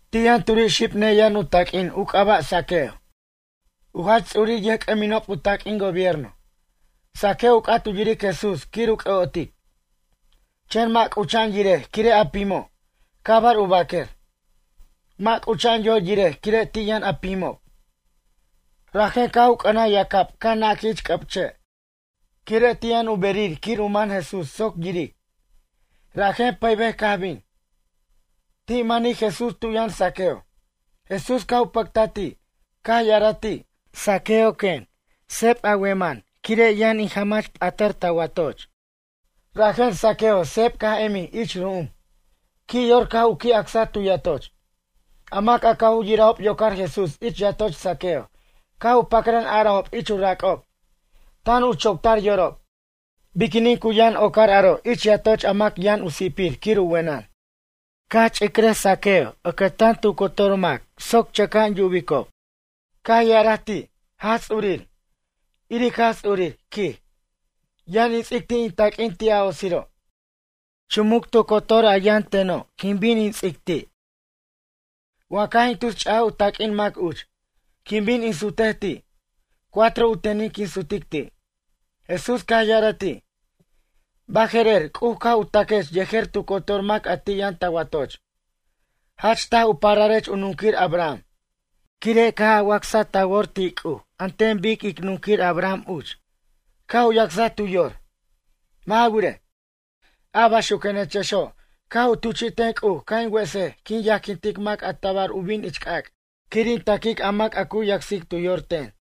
Ti' yʌn turi' xib neyʌn u taq'uin u c'aba' Zaqueo, u jach ts'urir yʌjc'ʌminob u taq'uin gobierno. Zaqueo u c'at u yiric Jesús quir u c'ʌ'otic, chen mʌ' c'ucha'an yirej quire' a pimob, cabar u baquer. Mʌ' c'ucha'an yor yirej quire' ti' yʌn a pimob. Rajen caj u c'ʌnaj yacab caj naquij ich c'ʌb che' quire' ti' yʌn u berir quir u man Jesús soc yiric. Rajen pʌybej caj bin. Ti' manij Jesús tu yʌn Zaqueo. Jesús caj u pʌctaj ti', caj ya'araj ti': ―Zaqueo ―quen―, seb a wemʌn quire' yʌn in jamach p'atʌr ta watoch. Rajen Zaqueo seb caj emij ich ru'um, qui' yor caj u qui' acsaj tu yatoch. A mac a caj u yirajob yocar Jesús ich yatoch Zaqueo caj u pacran arajob ich u rac'ob, tan u choctar yorob: ―Biquinin cu yʌn ocar aro' ich yatoch a mac yʌn u si'pir quir u wenʌn? Caj ch'icraj Zaqueo ʌcʌtan tu cotor mac soc chʌca'an yubicob. Caj ya'araj ti' Jaj Ts'urir: ―Iric Jaj Ts'urir ―quij―. Yʌn in ts'ic ti' in taq'uin ti' a otsiro'. Chumuc tu cotor a yʌn teno' quin bin in ts'ic ti'. Wa caj in tus ch'aj u taq'uin mac uch, quin bin in sutej ti'. Cuatro u tenin quin sutic ti'. Jesús caj ya'araj ti': ―Baje'rer C'uj caj u ta'quech yejer tu cotor mac a ti' yʌn ta watoch. Jach taj u pararech a nunquir Abraham, quire' caj a wacsaj ta wor ti' C'uj an ten bic ic nunquir Abraham uch, caj u yacsaj tu yor. Mʌ' ja wirej, a baxuquenechexo' caj u tuchi'ten C'uj ca' in wesej quin yajquintic mac a tabar u bin ich c'ac' quir in ta'quic a mac a cu yacsic tu yor ten.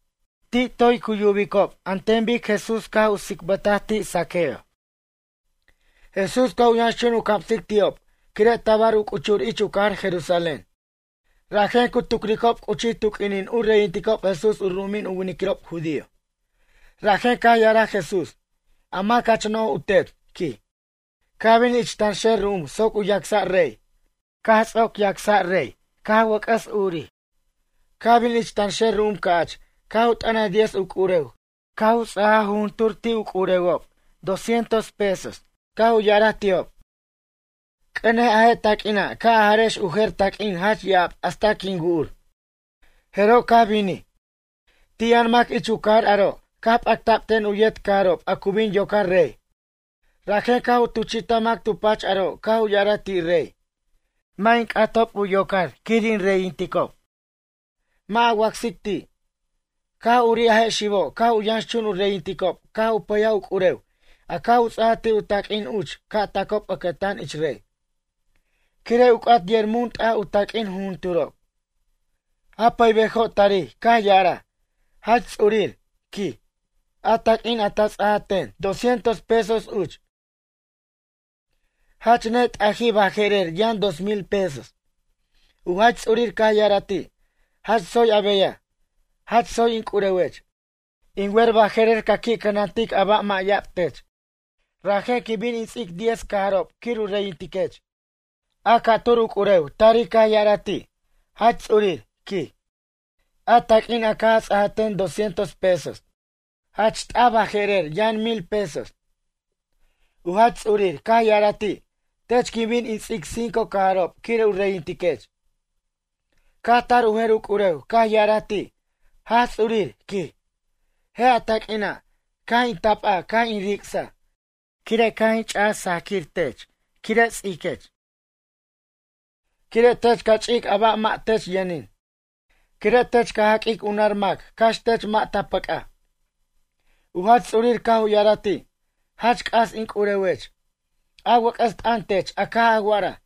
Ti' toy cu yubicob an ten bic Jesús caj u tsicbʌtaj ti' Zaqueo. Jesús caj u yʌnxchun u camsic ti'ob quire' tabar u c'uchur ich u cajar Jerusalén. Rajen cu tucricob c'uchij tu q'uinin u reyinticob Jesús u ru'umin u winiquirob judío. Rajen caj ya'araj Jesús: ―A mac jach no'j u tet ―quij―, caj bin ich tanxer ru'um soc u yacsa' rey. Caj ts'oc yacsa' rey caj wʌc'ʌs urij. Caj bin ich tanxer ru'um ca'ch caj u t'ʌnaj diez u c'urew caj u ts'aj jujuntur u c'urewob dos cientos pesos caj u ya'araj ti'ob: “C'ʌnej a je' taq'uina' ca' a jarex u jer taq'uin jach ya'ab hasta quin wu'ur.” Jeroj caj binij. Ti' yʌn mac ich u cajar aro' caj p'acta'b ten u yet cajarob a cu bin yocar rey. Rajen caj u tuchi'taj mac tu pach aro' caj u ya'araj ti' rey: “Mʌ' in c'atob u yocar quir in reyinticob. Mʌ' a wacsic ti'.” Caj urij a je' xibo' caj u yʌnxchun u reyinticob caj u pʌyaj u c'urew a caj u ts'a ti' u taq'uin uch ca' tacob ʌcʌtan ich rey. Quire' u c'at yer mun t'aj u taq'uin jujunturob. A pʌybejo' tarij caj ya'araj: “Jach Ts'urir ―quij―, a taq'uin a ta ts'aj ten, dos cientos pesos uch, jach net'ajij baje'rer yʌn dos mil pesos.” U jach ts'urir caj ya'araj ti': “Jach tsoy a beyaj, jach tsoy in c'urewech. In wer baje'rer ca qui' cʌnantic a ba' mʌ' ya'ab tech. Rajen quin bin in ts'ic diez cajarob quir u reyintiquech.” A ca'tur u c'urew tarij caj ya'araj ti': “Jach Ts'urir ―quij―. A taq'uin a caj a ts'aj ten dos cientos pesos, jach t'aj baje'rer yʌn mil pesos.” U jach ts'urir caj ya'araj ti': “Tech quin bin in ts'ic cinco cajarob quir u reyintiquech.” Caj tar u jer u c'urew caj ya'araj ti': “Jaj Ts'urir ―quij―, je' a taq'uina'. Caj in tapa caj in ric'saj, quire' caj in ch'aj sajaquir tech quire' ts'iquech. Quire' tech ca ch'ic a ba' mʌ' tech yʌnin. Quire' tech ca jaq'uic u nar mac cax tech mʌ' ta pʌc'aj.” U jach ts'urir caj u ya'araj ti': “Jach c'as in c'urewech, a wʌc'ʌs t'ʌn tech a caj a wa'araj.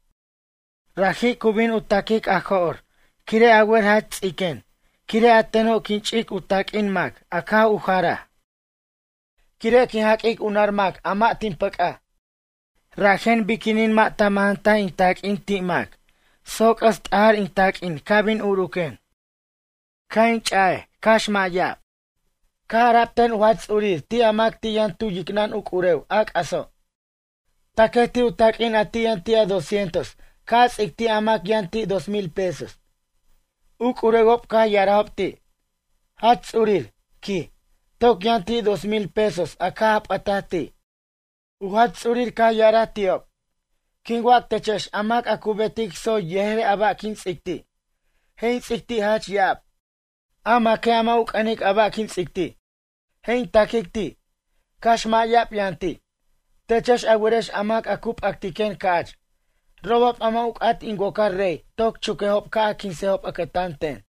Raji' cu bin u ta'quic a jo'r quire' a wer jach ts'iquen quire' a teno' quin ch'ic u taq'uin mac a caj u jaraj. Quire' quin jaq'uic u nar mac a mʌ' tin pʌc'aj. Rajen biquinin mʌ' ta majantaj in taq'uin ti' mac soc c'ʌs t'ajij in taq'uin ca' bin urquen. Ca' in ch'ic cax mʌ' ya'ab?” Caj ara'b ten u jach ts'urir ti' a mac ti' yʌn tu yicnʌn u c'urew a c'aso': “Taquej ti' u taq'uin a ti' yʌn ti' a dos cientos ca' a ts'ic ti' a mac yʌn ti' dos mil pesos.” U c'urewob caj ya'arajob ti': “Jach Ts'urir ―quij―, toc yʌn ti' dos mil pesos a caj a p'ʌtaj ti'.” U jach ts'uric caj ya'araj ti'ob: “Quin wac techex a mac a cu betic tsoy yejer a ba' quin ts'ic ti'. Je' in ts'ic ti' jach ya'ab. A maque' a mʌ' u c'ʌnic a ba' quin ts'ic ti'. Je' in ta'quic ti', cax mʌ' ya'ab yʌn ti'. Techex a werex a mac a cu p'actiquen ca'ch. Robob a mʌ' u c'at in wocar rey toc chuquejob ca' a quinsejob ʌcʌtan ten.”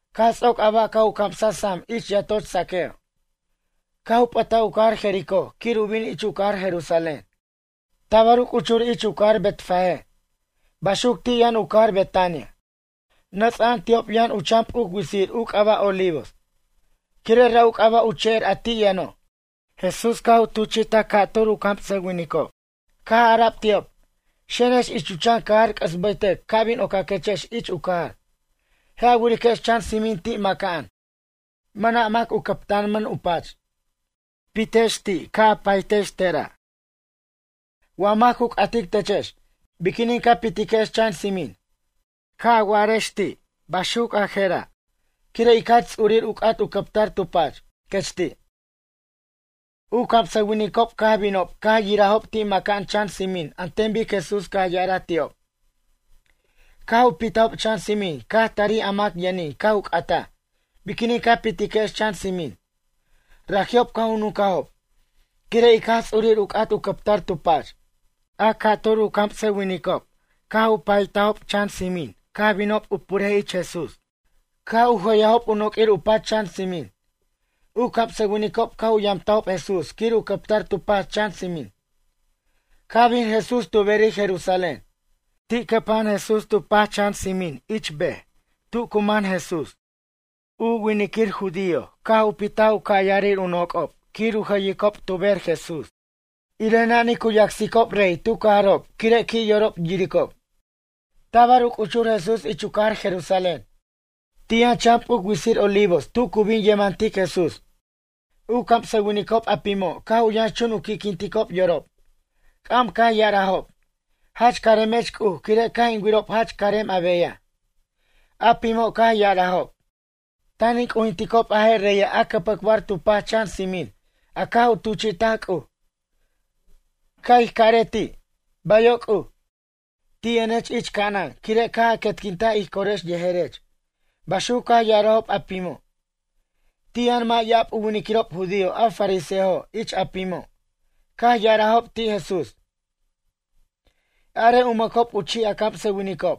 Caj ts'oc a ba' caj u camsa sam ich yatoch Zaqueo. Caj u p'ʌtaj u cajar Jericó quir u bin ich u cajar Jerusalén. Tabar u c'uchur ich u cajar Betfagé, baxuc ti' yʌn u cajar Betania, nʌts'a'an ti'ob yʌn u chan p'uc witsir u c'aba' Olivos. Quire' ra' u c'aba' u che'er a ti' yʌno'. Jesús caj u tuchi'taj ca'tur u camsʌwinicob. Caj ara'b ti'ob: ―Xenex ich u chan cajar c'ʌs bʌytʌc ca' bin ocaquechex ich u cajar. Je' a wirex chan tsimin ti' maca'an, mʌna' mac u cʌptanmʌn u pach. Pitex ti' ca' a paytex tera'. Wa mac cu c'atic techex: “Biquinin ca pitiquex chan tsimin?” Caj a waquex ti' baxuc a je'ra': “Quire' ic Jaj Ts'urir u c'at u cʌptar tu pach”, quech ti'. U camsʌwinicob caj binob caj yirajob ti' maca'an chan tsimin an ten bic Jesús caj ya'araj ti'ob. Caj u pitajob chan tsimin caj tarij a mac yʌnin caj u c'ataj: “Biquinin ca pitiquex chan tsimin?” Raji'ob caj u nuncajob: ―Quire' ic Jaj Ts'ur u c'at u cʌptar tu pach. A ca'tur u camsʌwinicob caj u paytajob chan tsimin caj binob u purej ich Jesús. Caj u jʌyajob u noq'uir u pach chan tsimin. U camsʌwinicob caj u yamtajob Jesús quir u cʌptar tu pach chan tsimin. Caj bin Jesús tu berir Jerusalén. Ti' cʌpa'an Jesús tu pach chan tsimin ich u bej tu cu man Jesús. A winiquir judíojo' caj u pitaj u ca' yarir u noc'ob quir u jʌyicob tu ber Jesús. Irej nanij cu yacsicob rey tu cajarob quire' qui' yorob yiricob. Tabar u c'uchur Jesús ich u cajar Jerusalén. Ti' yʌn chan p'uc witsir Olivos tu cu bin yemantic Jesús. U camsʌwinicob a pimo' caj u yʌnxchun u qui'quinticob yorob. C'am caj ya'arajob: ―Jach caremech C'uj quire' caj in wirob jach carem a beyaj. A pimo' caj ya'arajob: ―Tan in c'ujinticob a je' reya' a cʌpʌcbar tu pach chan tsimin a caj u tuchi'taj C'uj. Ca' ij carej ti': Bayo' C'uj, ti' yʌnech ich ca'anan quire' caj a quetquintaj ij corex yejerech ―baxuc caj ya'arajob a pimo'. Ti' yʌn mʌ' ya'ab u winiquirob judío a fariseojo' ich a pimo', caj ya'arajob ti' Jesús: ―Arej u mʌcob u chi' a camsʌwinicob.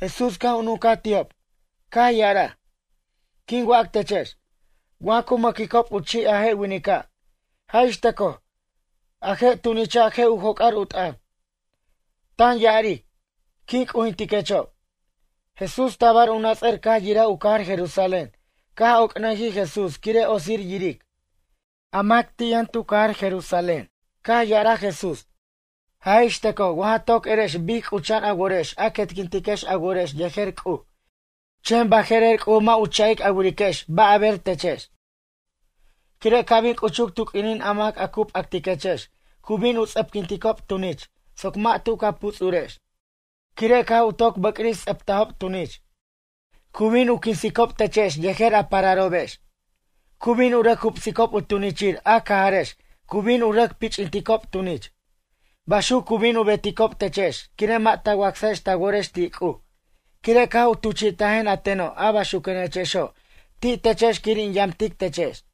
Jesús caj u nuncaj ti'ob, caj ya'araj: ―Quin wac techex, wa cu mʌquicob u chi' a je' winica', jaj ixtʌcoj, a je' tunicha' je' u joc'ar u t'ʌn, tan ya'aric: “Quin c'ujintiquechob.” Jesús tabar u nats'ʌr caj yiraj u cajar Jerusalén caj oc'nʌjij Jesús quire' otsir yiric, a mac ti' yʌn tu cajar Jerusalén. Caj ya'araj Jesús: ―Jaj ix tʌcoj wa ja toc erex bic c'ucha'an a worex a quetquintiquex a worex yejer C'uj chen baje'rer C'uj mʌ' u cha'ic a wiriquex ba' a ber techex. Quire' ca' bin c'uchuc tu q'uinin a mac a cu p'actiquechex cu bin u ts'ʌpquinticob tunich soc mʌ' tu ca puts'urex. Quire' caj u toc bʌcris ts'ʌptajob tunich. Cu bin u quinsicob techex yejer a pararobex. Cu bin u rʌc jubsicob u tunichir a cajarex cu bin u rʌc pich'inticob tunich. Baxuc cu bin u beticob techex quire' mʌ' ta wacsajex ta worex ti' C'uj quire' caj u tuchi'tajen a teno' a baxuquenechexo' ti' techex quir in yamtic techex.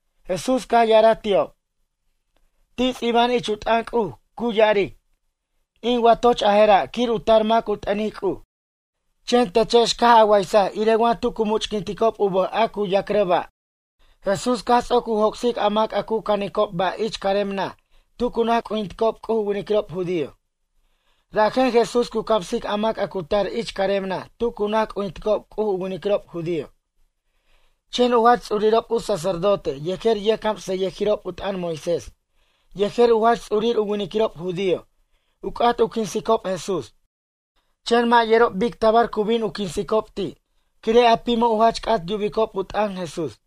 Jesús caj ya'araj ti'ob: ―Ti' ts'iba'an ich u t'ʌn C'uj, cu ya'aric: “In watoch a je'ra' quir u tar mac u t'ʌnic C'uj”, chen techex caj a waysaj irej wa tu cu much'quinticob u bʌj a cu yac'rʌ' ba'. Jesús caj ts'oc u joc'sic a mac a cu canicob ba' ich carem naj tu cu naj c'ujinticob C'uj u winiquirob judío. Rajra' Jesús cu camsic a mac a cu tar ich carem naj tu cu naj c'ujinticob C'uj u winiquirob judío. Chen u jach ts'urirob u sacerdote yejer yʌjcamsʌyʌjirob u t'ʌn Moisés yejer u jach ts'urir u winiquirob judío u c'at u quinsicob Jesús. Chen mʌ' yerob bic tabar cu bin u quinsicob ti' quire' a pimo' u jach c'at yubicob u t'ʌn Jesús.